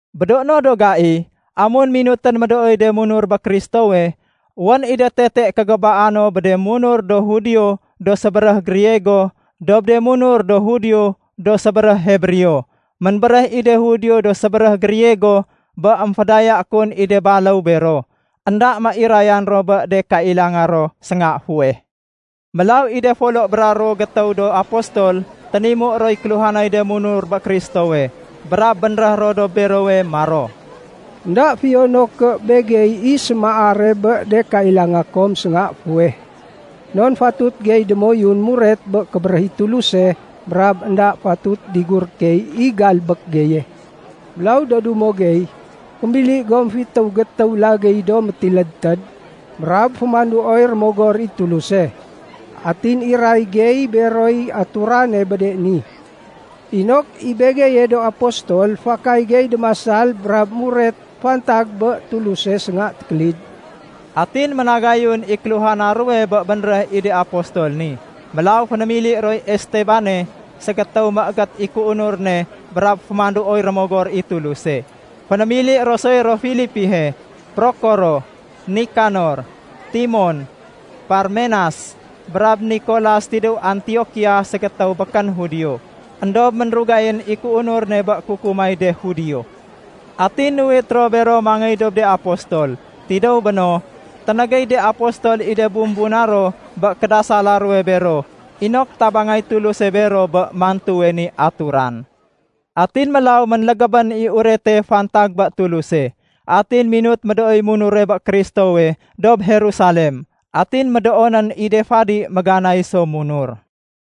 Bé do no do gai, amun minutén médooy de munur bé Kristowe, wén i de tete kégébaa no bé de munur do Judio do sébéréh Griego dob de munur do Judio do sébéréh Hebreo. Ménbéréh i de Judio do sébéréh Griego bé émfédaya kun i de baléw bero, énda méirayan ro bé de kailanga ro sénga fuweh. Mélaw i de folo bra ruwo gétéw do apostol ténimu roy kéluhanay de munur bé Kristowe brab bénréh ro dob berowe maro, “Enda fiyo no ké begey i sémaare bé de kailanga kom sénga fuweh, non fatut gey démoyun muret bé kébéréh i Tuluse, brab énda fatut diguré key i galbék geye. Mélaw do dumo gey, fémili gom fitéw gétéw lagéy, do métilédtéd brab fémanduoy Rémogor i Tuluse. Atin iray gey beroy aturane bé de ni, inok i begeye do apostol fakay gey démasal brab muret fantag bé Tuluse sénga tékélid.” Atin ménagayun i kéluhana ruwe bé bénréh i de apostol ni. Mélaw fénémili roy Estebane, ségétéw méégét i kéunur ne brab fémanduoy Rémogor i Tuluse. Fénémili ro soy ro Filipihe, Prokoro, Nikanor, Timon, Parmenas, brab Nikolas tidéw Antiokia ségétéw békén Judio, éndob ménrugayén i kéunur ne bé kukumay de Judio. Atin nuwit ro bero mangéy dob de apostol. Tidéw béno, ténégéy de apostol i de bumbuna ro bé kédasala ruwe bero inok tabangay Tuluse bero bé mantuwe ni aturan. Atin mélaw ménlégébén i urete fantag bé Tuluse. Atin minut médooy munure bé Kristowe dob Jerusalem. Atin médoonén i de fadi méganay so munur.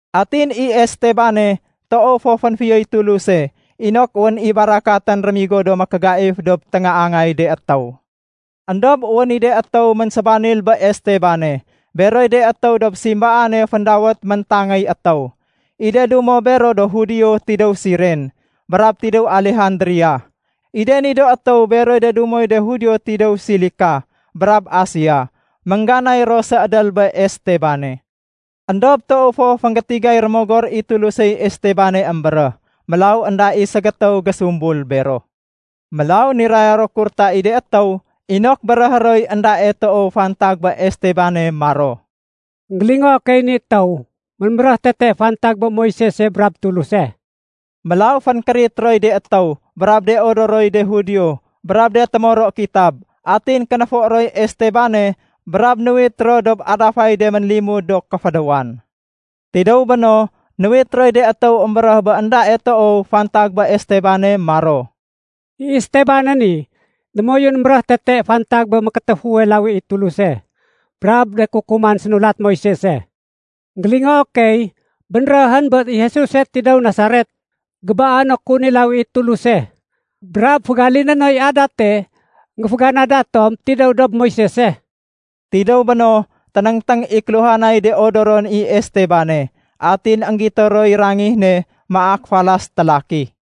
Atin i Estebane toow fo fénfiyoy Tuluse inok wén i barakatén rémigo do mékégaif dob téngaangay de étéw. Endob wén i de étéw ménsébanil bé Estebane. Beroy de étéw dob simbaane féndawét “Méntangéy étéw”. I de dumo bero do Judio tidéw Siren, brab tidéw Alejandria, I de ni do étéw beroy de dumoy de Judio tidéw. Silika brab Asia, méngganay ro séédél bé Estebane. Endob toow fo fénggétigay Rémogor i Tulusey Estebane émbéréh. Mélaw énda i ségétéw gésumbul bero. Mélaw niraya ro kurta i de étéw inok béréhé roy éndae toow fantag bé Estebane maro, “Enggélingoo key i ni étéw ménbéréh tete fantag bé Moisese brab Tuluse.” Mélaw fénkérit roy de étéw brab de odoroy de Judio brab de témoro kitab. Atin kénéfo roy Estebane brab nuwit ro dob adafay de ménlimud do kéfédéwan. Tidéw béno, nuwit roy de étéw émbéréh bé éndae toow fantag bé Estebane maro, “I Estebane ni démoyun émbéréh tete fantag bé mékétéfuwe lawi i Tuluse brab de kukuman sénulat Moisese. Enggélingoo key bénréhén bé i Jesuse tidéw Nasaret, gébaé no kun i lawi i Tuluse brab fégaliné noy adate énggéféganada tom tidéw dob Moisese.” Tidéw béno, ténéngténg i kéluhanay de odoron i Estebane. Atin énggito roy rangih ne maak falas télaki.